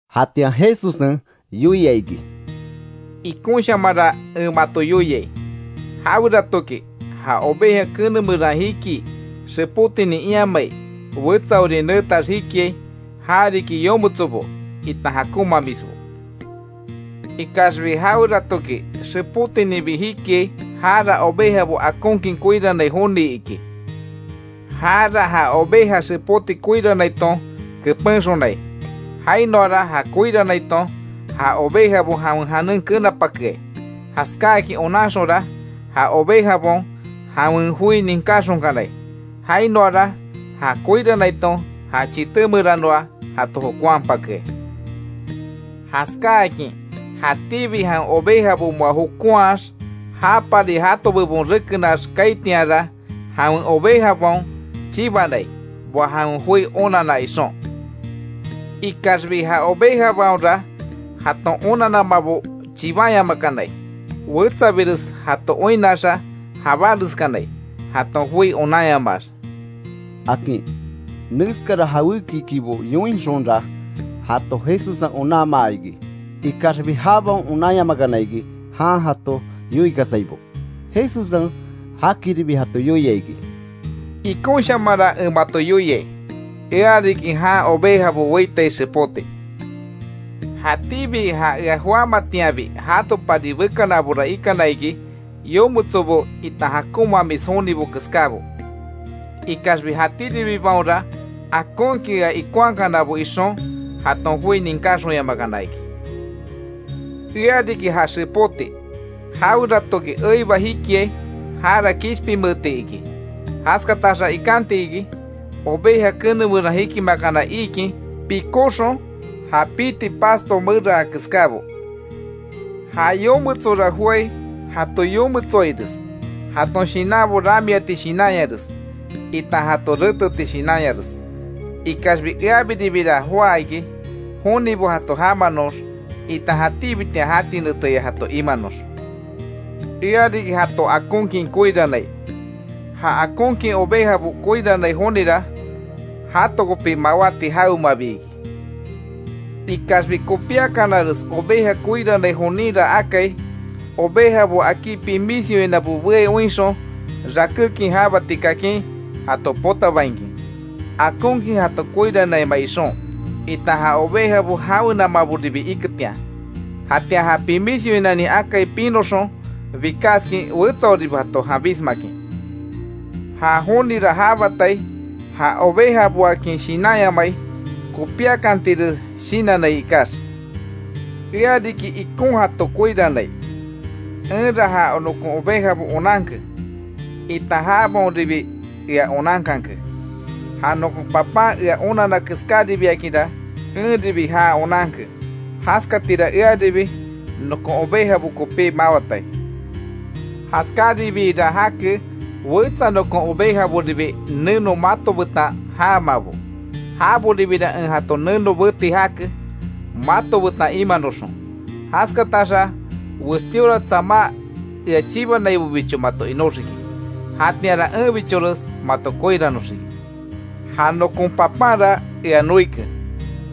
Jatian Jesussen yoia iki: “Ikonshamanra en mato yoiai, jaweratoki ja oveja kene meran jikii, xepótinin iamai, wetsaori neetax jikiai, ja riki yometsobo itan jakonmamisbo. Ikaxbi jaweratoki xepótininbi jikiai, jara ovejabo akonkin koirannai joni iki, jara ja oveja xepóti koiranaiton kepenxonai. Jainoara ja koiranaiton, ja ovejabo jawen janen kenapakeai, Jaskáakin onanxonra, ja ovejabaon, jawen joi ninkáxonkanai, jainoara ja koiranaiton ja chité meranoa jato jokonhapakeai. Jaskáakin jatíbi jawen ovejabo moa jokonhax, japari jato bebon rekenax kaaitianra, jawen ovejabaon chibanai, moa jawen joi onanna ixon. Ikaxbi ja ovejabaonra jaton onanamabo chibanyamakanai. Wetsabires jato oinnaxa, jabáreskanai jaton joi onanyamaax”, akin. Neskara jawékikibo yoinxonra, jato Jesussen onanmaa iki, ikaxbi jabaon onanyamakana iki jan jato yoikasaibo. Jesussen jakiribi jato yoia iki: “Ikonshamanra en mato yoiai: Ea riki jan ovejabo weitai xepóti, jatíbi ja ea joámatianbi jatopari bekanabora ikana iki yometso itan jakonmamis jonibo keskabo, ikaxbi jatíribibaonra akonkin ea ikonhakanabo ixon jaton joi ninkáxonyamakana iki. Ea riki ja xepóti, jaweratoki eiba jikiai jara kishpinmeeti iki, jaskataxa ikanti iki, oveja kene meran jikimakana iikin pikóxon ja piti pasto meraa keskábo. Ja yometsora joái jato yometsoaires jaton shinanbo ramiati shinanyares, itan jato réteti shinanyares. Ikaxbi eabiribira joá iki, jonibo jato jamanox, itan jatíbitian jati neteya jato imanox. Ea riki jato akonkin koirannai, ja akonkin ovejabo koirannai jonira, jato kopi mawáti jawemabi iki. Ikaxbi kopiakanares oveja koirannai joninra akai ovejabo akí pimis yoinabo beai oinxon rakékin jabati kakin jato potabainkin, akonkin jato koiranaima ixon itan ja ovejabo jawenamaboribi iketian, jatian ja pimís yoinanin akai pinoxon, bikaskin wetsaoribo jato janbismakin. Ja jonira jabatai, ja ovejaboakin shinanyamai kopíakantires shinannai ikax. Ea riki ikon jato koirannai, enra ja nokon ovejabo onanke itan jabaonribi ea onankanke. Ja nokon Papan en onanna keskáribiakinra, enribi já onanke, jaskatira earibi, nokon ovejabo kopí mawatai. Jaskaribiira jake wetsa nokon ovejaboribi neno mato betan jaamabo, jaboribira en jato neno beti jake, mato betan imanoxon: Jaskataxa westíora tsama ea chibanaibobicho mato inóxiki. Jatianra enbichores mato koiranoxiki. Ja nokon Papanra ea noike,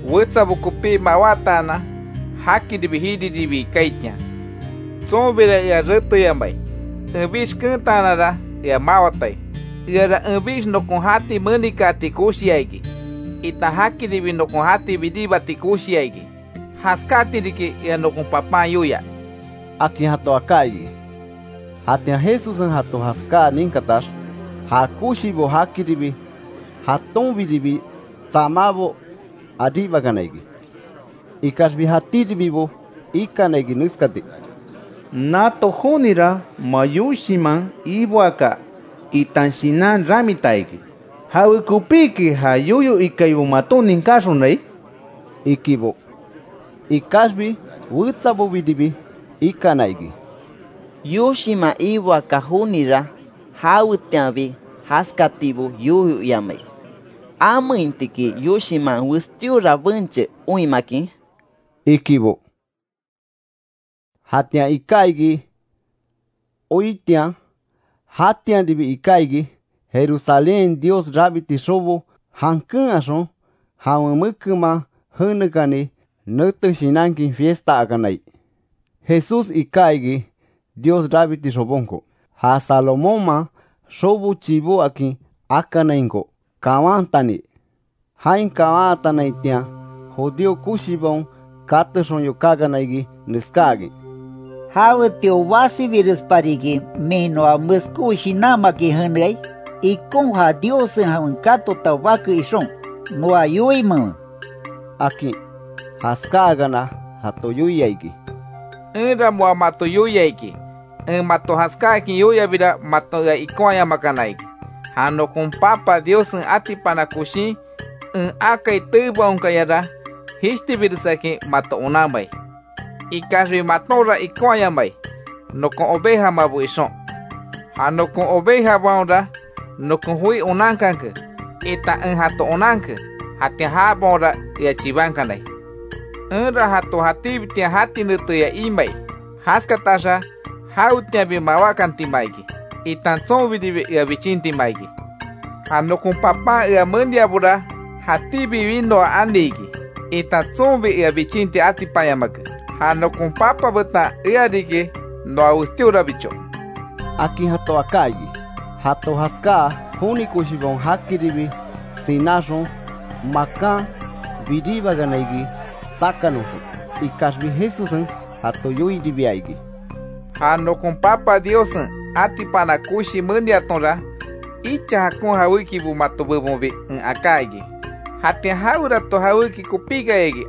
wetsabo kopí mawátaanan jakiribi jiriribii kaaitian. Tsonbira ea reteyamai, enbix keentaananra ea mawatai. Eara enbix nokon jati menikaati koshia iki, itan jakiribi nokon jati biribati koshia iki. Jaskátiriki ea nokon Papan yoia”, akin jato aká iki. Jatian Jesussen jato jaskáa ninkatax, ja koshibo jakiribi jatonbiribi tsámabo aribakana iki. Ikaxbi jatíribibo ikana iki neskati: —Nato jonira moa yoshinman iboaka itan shinan ramita iki, ¿Jawekopiki ja yoyo ikaibo maton ninkaxonai? —ikibo. Ikaxbi wetsabobiribi ikana iki: —Yoshiman iboaka jonira, jawetianbi jaskatibo yoyo iamai. ¿Ameinti iki yoshinman westíora benche oinmakin? —ikibo. Jatian iká iki oitian. Jatianribi iká iki, Jerusalénhain Dios rabiti xobo jankenhaxon jawen mekenman jenekani nete shinankin, fiestaakanai. Jesús iká iki Dios rabiti xobonko, ja Salomónman xobo chibó akin akanainko kawantani. Jain kawantanaitian, judío koshibaon katexon yokákana iki neskáakin: —¿Jawetio basibirespariki min noa meskó shinanmakin jeneai? Ikon ja Diossen jawen katota bake ixon, noa yoimenwe —akin. Jaskáakana jato yoia iki: —Enra moa mato yoia iki. En mato jaskáakin yoiabira, maton ea ikonhayamakana iki. Ja nokon Papa Diossen atipana koshin en akai teebaonkayara jishtibiresakin mato onanmai. Ikaxbi matonra ikonhaayamai, nokon ovejamabo ixon. Ja nokon ovejabaonra nokon joi onankanke, itan en jato onanke, jatian jabaonra ea chibankanai. Enra jato jatíbitian jati neteya imai, jaskataxa jawetianbi mawákantima iki, itan tsonbiribi ea bichintima iki. Ja nokon Papan ea meniabora, jatíbi winoa ani iki, itan tsonbi ea bichinti atipanyamake. Ja nokon Papa betan ea riki noa westíorabicho —akin jato aká iki. Jato jaskáa joni koshibaon jakiribi sináxon, makan biríbakana iki tsakanoxon. Ikaxbi Jesussen jato yoiribia iki: —Ja nokon Papa Diossen atipana koshi meniatonra, icha jakon jawékibo mato bebonbi en aká iki. ¿Jatian jawerato jawéki kopíkayaki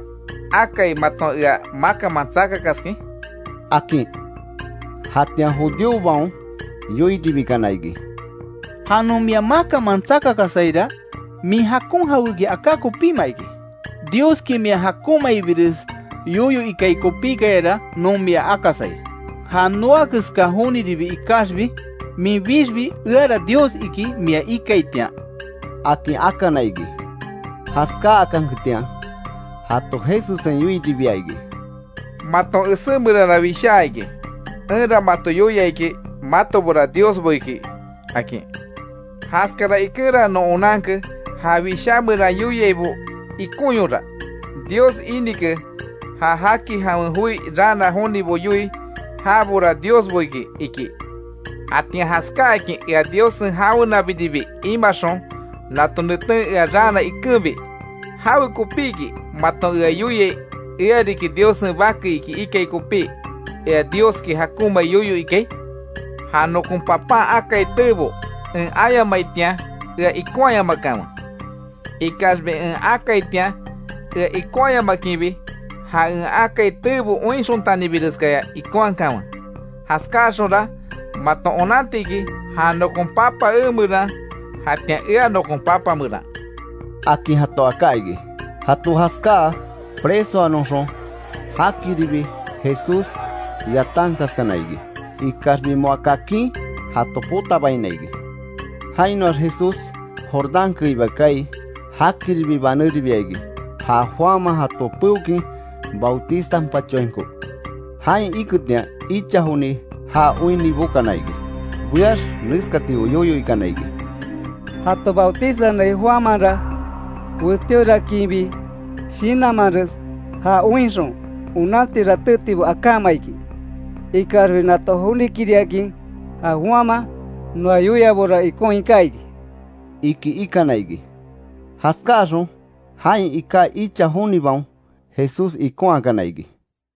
akai maton ea makanman tsakakaskin? —akin. Jatian judíobaon yoiribikana iki: —Ja non mia makanman tsakakasaira, min jakon jawéki aká kopíma iki, Dioski mia jakonmaibires yoyo ikai kopíkayara non mia akasai. Ja noa keska joniribi ikaxbi minbixbi eara Dios iki mia ikaitian —akin akana iki. Jaskákanketian jato Jesussen yoiribia iki: —Maton esé meranra wishaa iki: ‘Enra mato yoia iki matobora diosbo iki’, akin. Jaskara ikenra non onanke, ja Wishá meran yoiaibo ikonyora; Dios inike, ja jaki jawen joi raana jonibo yoii, jabora diosbo iki, ikí. Jatian jaskáakin ea Diossen jawenabiribi imaxon, nato neten ea raana ikenbi, ¿Jawekopíki maton ea yoiai, eariki Diossen Bake iki ikai kopí, ea Dioski jakonmai yoyo ikai? Ja nokon Papan akai teebo en ayamaitian, ea ikonhayamakanwe. Ikaxbi en akaitian, ea ikonhayamakinbi, ja en akai teebo oinxontanibireskaya ikonhakanwe; jaskáaxonra maton onantiki ja nokon Papa emeran, jatian ea nokon Papa meran —akin jato aká iki. Jato jaskáa, presoanoxon jakiribi Jesús yatankaskana iki, ikaxbi moa kakin jato potabaina iki. Jainoax Jesús Jordán keiba kaai, jakiribi baneribia iki; ja Juanman jato peokin bautizanpachoainko. Jain iketian icha joni ja oinni bokana iki; beax neskatibo yoyo ikana iki: —Jato bautizanai Juanmanra, westíoraakinbi shinanmanres ja oinxon onanti ratétibo akáma iki. Ikaxbi nato jonikiriakin ja Juanman noa yoiabora ikon iká iki —iki ikana iki. Jaskáxon, jain ika icha jonibaon Jesús ikonhakana iki.